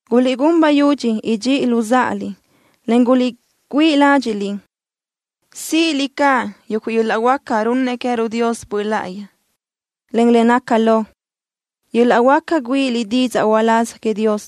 Guliʼgún bayudxi idxíʼiliʼ luzáʼaliʼ, en guliʼgüíʼ ládxiʼliʼ síʼiliʼ caʼ yuguʼ yöl-laʼ huáca runnëʼ queë́ruʼ Dios Böʼ Láʼayi, en le naca lo, yöl-laʼ huáca güíʼiliʼ didzaʼ uláz queëʼ Dios.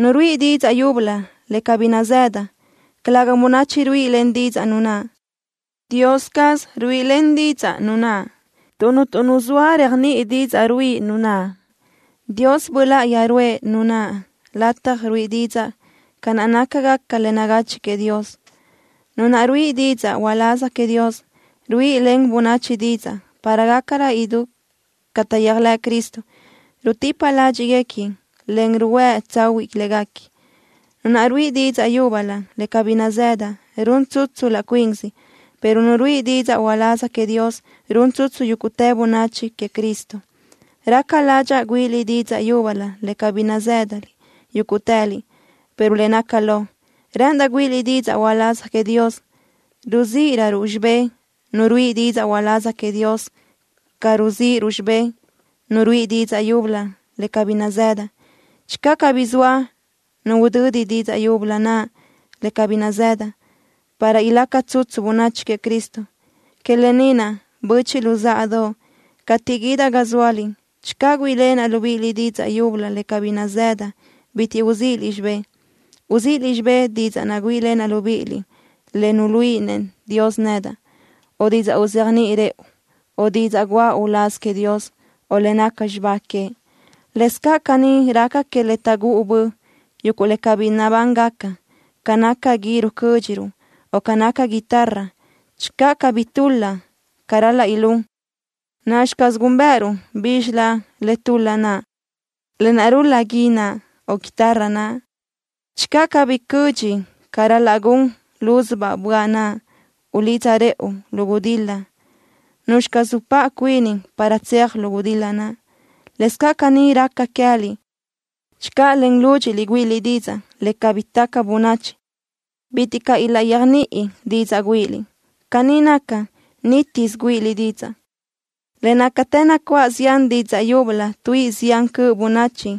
Nu ruíʼi didzaʼ yúbölö le cabí nazëda, calëga bönachi ruíʼilen didzaʼ nu naʼ. Dios caz ruíʼilen didzaʼ nu naʼ, tuʼ cuntu nu zoa réajniʼi didzaʼ ruíʼi nu naʼ. Dios Böʼ Láʼayi ruʼë nu naʼ lataj ruíʼi didzaʼ ca nácagaca le nagachiʼ queëʼ Dios. Nu naʼ ruíʼi didzaʼ uláz queëʼ Dios, ruíʼilen bönachi didzaʼ para gácarö idú ca taʼyéajlëʼ Cristo. Rutipa ládxiʼguequi, en ruhuë́ tsahuiʼ léguequi. Nu naʼ ruíʼi didzaʼ yúbölö le cabí nazëda run tsutsu laʼ cuinsi, pero nu ruíʼi didzaʼ uláz queëʼ Dios run tsutsu yúguʼtë bönachi queëʼ Cristo. Raca ládxaʼa güíʼiliʼ didzaʼ yúbölö le cabí nazë́daliʼ yúguʼtëliʼ, pero le naca lo, rë́ʼëndaʼ güíʼiliʼ didzaʼ uláz queëʼ Dios. Ruzíʼiröruʼ xibé nu ruíʼi didzaʼ uláz queëʼ Dios ca ruzíʼiruʼ xibé nu ruíʼi didzaʼ yúbölö le cabí nazëda, channö cabí zoa nu udödi didzaʼ yúbölö naʼ le cabí nazëda, para ilaca tsutsu bönachi queëʼ Cristo. Que lë ni naʼ, böchiʼ luzáʼadoʼ, cateʼ guídaʼ ga zóaliʼ, channö güíʼilenaʼ libíʼiliʼ didzaʼ yúbölö le cabí nazëdaʼ, bitiʼ bi uzíʼiliʼ xibé. Uzíʼisiliʼ xibé didzaʼ naʼ güíʼilenaʼ libíʼiliʼ le nuluíʼinëʼ Dios nedaʼ, o didzaʼ uzéajniʼi rëʼu, o didzaʼ guʼa uláz queëʼ Dios, o le naca xibá queëʼ. Lëscaʼ caní raca que le taʼgúʼu bö, yuguʼ le cabí nabángaca, ca naca gui rucö́dxiruʼ, o ca naca guitarra. Channö cabí tul-la ca ral-laʼ ilún, ¿nacxi caz gúnbëʼëruʼ bízxilö le tul-la naʼ, lë naʼ rul-la gui naʼ, o guitarra naʼ? Channö cabí cödxi ca ral-laʼ gun lúzubaʼ böaʼ naʼ ulidza rëʼu lu gudil-la, ¿nuzxi caz upáʼ cuini para tseaj lu gudil-la naʼ? Lëscaʼ caní raca queë́liʼ. Channö len lúdxiʼliʼ güíʼiliʼ didzaʼ le cabí taca bönachi, bitiʼ caʼ ilaʼyéajniʼi didzaʼ güíʼiliʼ. Caní gaca, nítisö güíʼiliʼ didzaʼ. Le nácatë nacuáʼ zián didzaʼ yúbölö tuíʼi zián cöʼ bönachi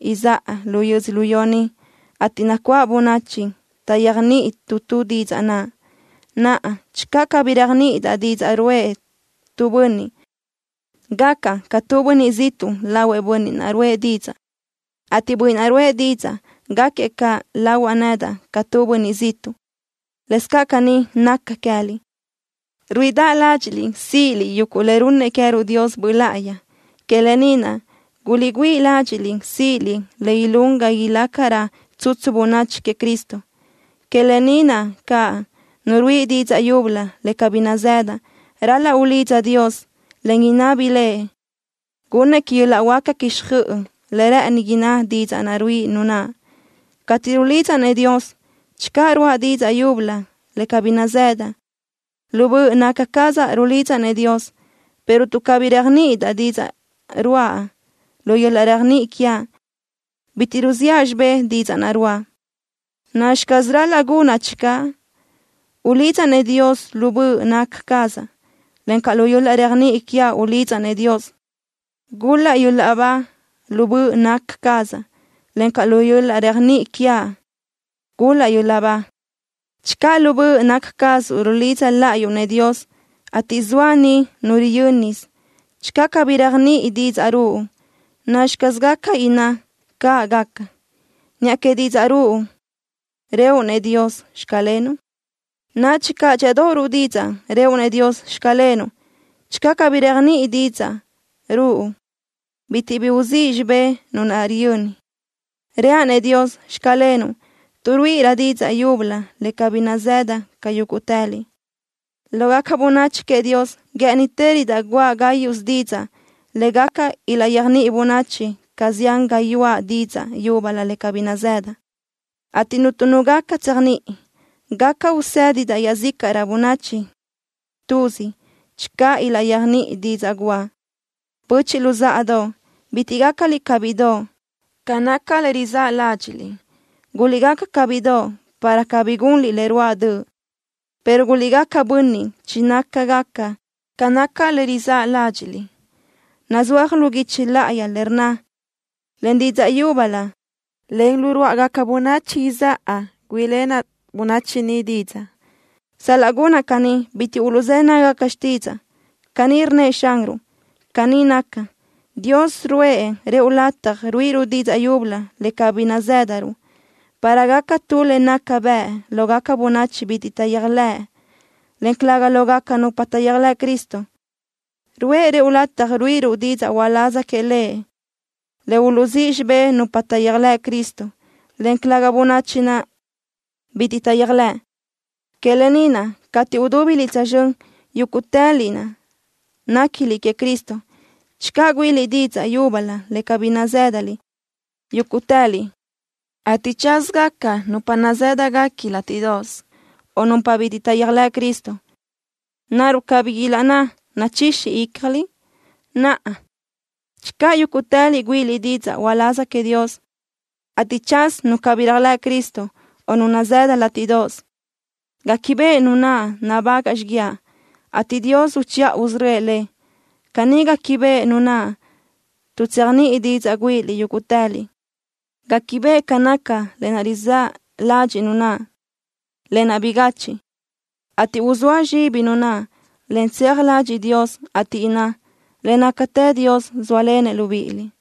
izáʼa lu yödzölió ni, ateʼ nacuáʼ bönachi taʼyéajniʼi tu tu didzaʼ naʼ. Naʼa, channö cabí réajniʼidaʼ didzaʼ ruʼë tu bönniʼ, gacaʼ ca tu bönniʼ ziʼtuʼ lahuëʼ bönniʼ naʼ ruʼë didzaʼ, ateʼ bönniʼ naʼ ruʼë didzaʼ gáquiëʼ caʼ lahuaʼ nedaʼ ca tu bönniʼ ziʼtuʼ. Lëscaʼ caní naca queë́liʼ. Ruíʼidaʼ ládxiʼliʼ síʼiliʼ yuguʼ le runnëʼ queë́ruʼ Dios Böʼ Láʼayi. Que lë ni naʼ, guliʼgüíʼ ládxiʼliʼ síʼiliʼ le ilún ga ilácarö tsutsu bönachi queëʼ Cristo. Que lë ni naʼ caʼ, nu ruíʼi didzaʼ yúbölö le cabí nazëda ral-laʼ ulidza Dios, en inabi Lëʼ gunnëʼ que yöl-laʼ huáca quixjöʼ le rë́ʼëni inná didzaʼ naʼ ruíʼi nu naʼ. Cateʼ rulidzaʼ-nëʼ Dios, channö ruáʼa didzaʼ yúbölö le cabí nazëdaʼ, lu böʼ naca cazaʼ rulidzaʼ-nëʼ Dios, pero tuʼ cabí réajniʼidaʼ didzaʼ ruáʼa, lu yöl-laʼ réajniʼi quiaʼ bitiʼ ruziʼa xibé didzaʼ naʼ ruáʼa. ¿Nacxi caz ral-laʼ gunaʼ channö? Ulidzaʼ-nëʼ Dios lu böʼ naca cazaʼ, encaʼ lu yöl-laʼ réajniʼi quiaʼ ulidzaʼ-nëʼ Dios. Gul-laʼ yöl-laʼ ba lu böʼ naca cazaʼ, encaʼ lu yöl-laʼ réajniʼi quiaʼ gul-laʼ yöl-laʼ ba. Channö lu böʼ naca cazuʼ rulidza láʼayuʼ-nëʼ Dios, ateʼ zoa niʼ nu riyö́nisö, channö cabí réajniʼi didzaʼ ruʼu, ¿nacxi caz gaca inná: “Caʼ gaca”, niʼa que didzaʼ ruʼu, rëʼu-nëʼ Dios: “Xclenuʼ”? Nadxi caʼ dxíʼadoʼ ruʼu didzaʼ, rëʼu-nëʼ Dios: “Xclenuʼ.” Channö cabí réajniʼi didzaʼ ruʼu, bitiʼ bi uzíʼ xibé nu naʼ riyöni. Reaʼ-nëʼ Dios: “Xclenuʼ”, tuʼ ruíʼiraʼ didzaʼ yúbölö le cabí nazëdaʼ ca yúguʼtëliʼ. Lógaca bönachi queëʼ Dios guë́ʼënitërödaʼ guʼa gáyuʼsö didzaʼ le gaca ilaʼyéajniʼi bönachi ca zián gayuáʼ didzaʼ yúbölö le cabí nazëdaʼ, ateʼ cuntu nu gaca tséajniʼi. Gaca usédidaʼ iaʼzícaʼrö bönachi tuzi channö ilaʼyéajniʼi didzaʼ guʼa. Böchiʼ luzáʼadoʼ, bitiʼ gácaliʼ ca bíʼidoʼ ca naca le rizáʼ ládxiʼliʼ. Guliʼgaca ca bíʼidoʼ para cabí gunliʼ le ruáʼ döʼ, pero guliʼgaca bönniʼ chinácagaca ca naca le rizáʼ ládxiʼliʼ. Nazúaj lu guichi láʼayi le rnna: “Len didzaʼ yúbölö, en lu ruáʼagaca bönachi izáʼa güíʼilenaʼ bönachi ni didzaʼ. Sal-laʼ gunaʼ caní, bitiʼ uluʼzë́ nágagaca xtídzaʼa.” ¡Caní rnnëʼ Xanruʼ! Caní naca, Dios ruʼë rëʼu lataj ruíʼiruʼ didzaʼ yúbölö le cabí nazë́daruʼ para gaca tu le naca bëʼ lógaca bönachi bitiʼ taʼyéajlëʼ, en calëga lógaca nupa taʼyéajlëʼ Cristo. Ruʼë rëʼu lataj ruíʼiruʼ didzaʼ uláz queëʼ Lëʼ le uluʼzíʼ xibé nupa taʼyéajlëʼ Cristo, en calëga bönachi naʼ bitiʼ taʼyéajlëʼ. Que lë ni naʼ, cateʼ udúbiliʼ tsözxö́n, yúguʼtëliʼ naʼ néquiliʼ queëʼ Cristo, channö güíʼiliʼ didzaʼ yúbölö le cabí nazë́daliʼ yúguʼtëliʼ, ateʼ tsázagaca nupa nazë́dagaca látiʼdoʼos, o nupa bitiʼ taʼyéajlëʼ Cristo, ¿naruʼ cabí ilaʼnná: “Nachixi ícjaliʼ”? Naʼa, channö yúguʼtëliʼ güíʼiliʼ didzaʼ uláz queëʼ Dios, ateʼ tsaz nu cabí réajlëʼ Cristo o nu nazëda látiʼdoʼos, guéquibeʼe nu naʼ nabagaʼ xíguiaʼ, ateʼ Dios uchiʼa usörö́ëʼ lëʼ. Caní guéquibeʼe nu naʼ, tuʼ tseajniʼi didzaʼ güíʼiliʼ yúguʼtëliʼ. Guéquibeʼe ca naca le rizáʼ ladxiʼ nu naʼ, lë naʼ bigachiʼ, ateʼ uzóa zxibi nu naʼ, en tseaj ladxiʼ Dios, ateʼ inná: “Le nácatë Dios zóalenëʼ libíʼiliʼ.”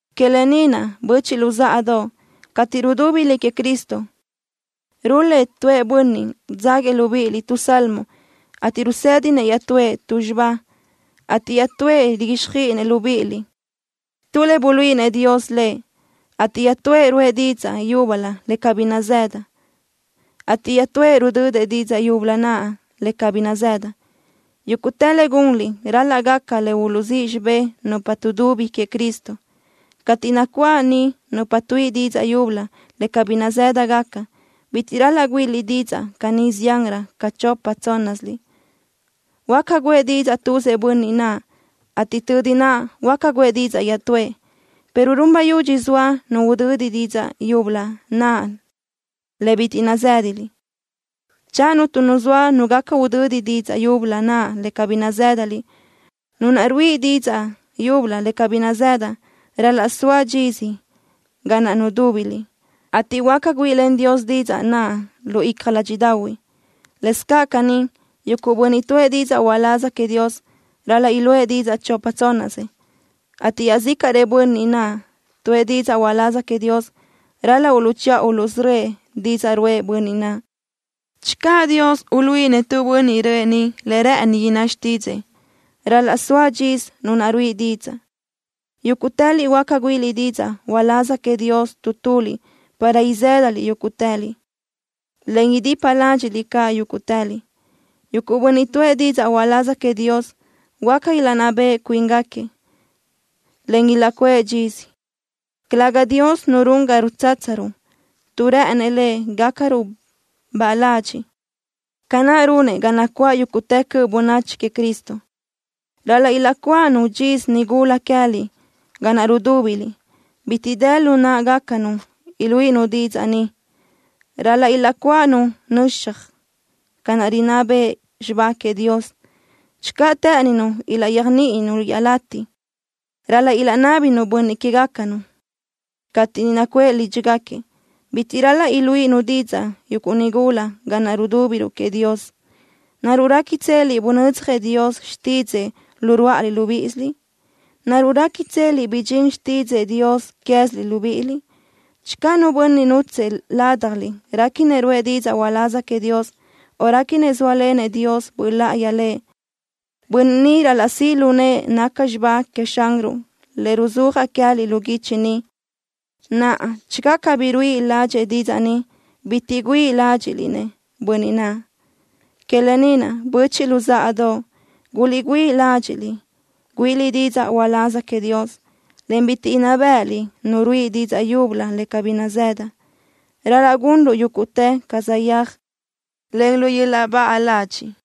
Que lë ni naʼ, böchiʼ luzáʼadoʼ, cateʼ rudúbiliʼ queëʼ Cristo, rul-lëʼ tuëʼ bönniʼ dzáguiëʼ libíʼiliʼ tu salmo, ateʼ rusédinëʼ iaʼtúëʼ tu xibá, ateʼ iaʼtúëʼ riguíxjöiʼinëʼ libíʼiliʼ tu le buluíʼinëʼ Dios lëʼ, ateʼ iaʼtúëʼ ruʼë didzaʼ yúbölö le cabí nazëdëʼ, ateʼ iaʼtúëʼ rudödëʼ didzaʼ yúbölö naʼ le cabí nazëdëʼ. Yúguʼtë le gunliʼ ral-laʼ gaca le uluʼzíʼ xibé nupa tuʼdubi queëʼ Cristo. Cateʼ nacuáʼ niʼ nupa tuíʼi didzaʼ yúbölö le cabí nazë́dagaca, bitiʼ ral-laʼ güíʼiliʼ didzaʼ caní ziánrö ca chopa tsónnasiliʼ. Huáca guʼë didzaʼ tuzëʼ bönniʼ naʼ, ateʼ tödi naʼ huáca guʼë didzaʼ iaʼtúëʼ, pero run bayudxi soa nu udödi didzaʼ yúbölö naʼ le bitiʼ nazë́daliʼ. Channö cuntu nu zoa nu gaca udödi didzaʼ yúbölö naʼ le cabí nazë́daliʼ, nu naʼ ruíʼi didzaʼ yúbölö le cabí nazëda ral-laʼ soa dxisö ga naʼ nudúbiliʼ, ateʼ huáca güíʼilen Dios didzaʼ naʼ lu icja ládxiʼdaʼahui. Lëscaʼ caní, yuguʼ bönniʼ tuʼë didzaʼ uláz queëʼ Dios ral-laʼ iluʼë didzaʼ chopa tsónnasëʼ, ateʼ iaʼzícaʼrëʼ bönniʼ naʼ tuʼë didzaʼ uláz queëʼ Dios ral-laʼ uluʼchiʼa uluʼsörö́ëʼ didzaʼ ruʼë bönniʼ naʼ. Channö Dios uluíʼinëʼ tu bönniʼ röʼë niʼ le rë́ʼëni inná xtídzëʼë, ral-laʼ soa dxisö nu naʼ ruíʼi didzaʼ. Yúguʼtëliʼ huáca güíʼiliʼ didzaʼ uláz queëʼ Dios tu tuliʼ para izë́daliʼ yúguʼtëliʼ, en idipa ládxiʼliʼ caʼ yúguʼtëliʼ. Yuguʼ bönniʼ tuʼë didzaʼ uláz queëʼ Dios huáca ilaʼnná beʼe cuíngaquiëʼ, en ilaʼcuʼë dxisö. Calëga Dios nu run ga rutsátsaruʼ, tuʼ rë́ʼënëʼ Lëʼ gácaruʼ baʼa ladxiʼ, ca naʼ runëʼ ga nacuáʼ yúguʼtë cöʼ bönachi queëʼ Cristo. Ral-laʼ ilaʼcuáʼanu dxisö nigula queë́liʼ ga naʼ rudúbiliʼ. Bitiʼ dë lu náʼagacanu iluíʼinu didzaʼ niʼ. Ral-laʼ ilaʼcuáʼanu nöxaj ca naʼ rinná bëʼ xibá queëʼ Dios. Channö të́ʼëninu ilaʼyéajniʼinu iaʼlatiʼ, ral-laʼ ilaʼnábinu bönniʼ que queë́gacanu cateʼ niʼ nacuʼë lídxigaquiëʼ. Bitiʼ ral-laʼ iluíʼinu didzaʼ yuguʼ nigula ga naʼ rudúbiruʼ queëʼ Dios. ¿Naruʼ réquitseliʼ bunödzjëʼ Dios xtídzëʼë lu ruáʼaliʼ libíʼisiliʼ? ¿Naruʼ réquitseliʼ bidxín xtídzëʼë Dios queë́ziliʼ libíʼiliʼ? Channö nu bönniʼ nútsëʼë ládjaliʼ réquinëʼ ruʼë didzaʼ uláz queëʼ Dios, o réquinëʼ zóalenëʼ Dios Böʼ Láʼayi lëʼ, bönniʼ ni ral-laʼ siʼ lu nëʼë naca xibá queëʼ Xanruʼ le ruzúajaʼ queë́liʼ lu guichi ni. Naʼa, channö cabí ruíʼi ládxëʼë didzaʼ ni, bitiʼ güíʼi ládxiʼliʼ-nëʼ bönniʼ naʼ. Que lë ni naʼ, böchiʼ luzáʼadoʼ, guliʼgüíʼ ládxiʼliʼ güíʼiliʼ didzaʼ uláz queëʼ Dios, en bitiʼ inná béʼeliʼ nu ruíʼi didzaʼ yúbölö le cabí nazëda. Ral-laʼ gunruʼ yúguʼtë ca saʼyéaj, en lu yöl-laʼ baʼa ladxiʼ.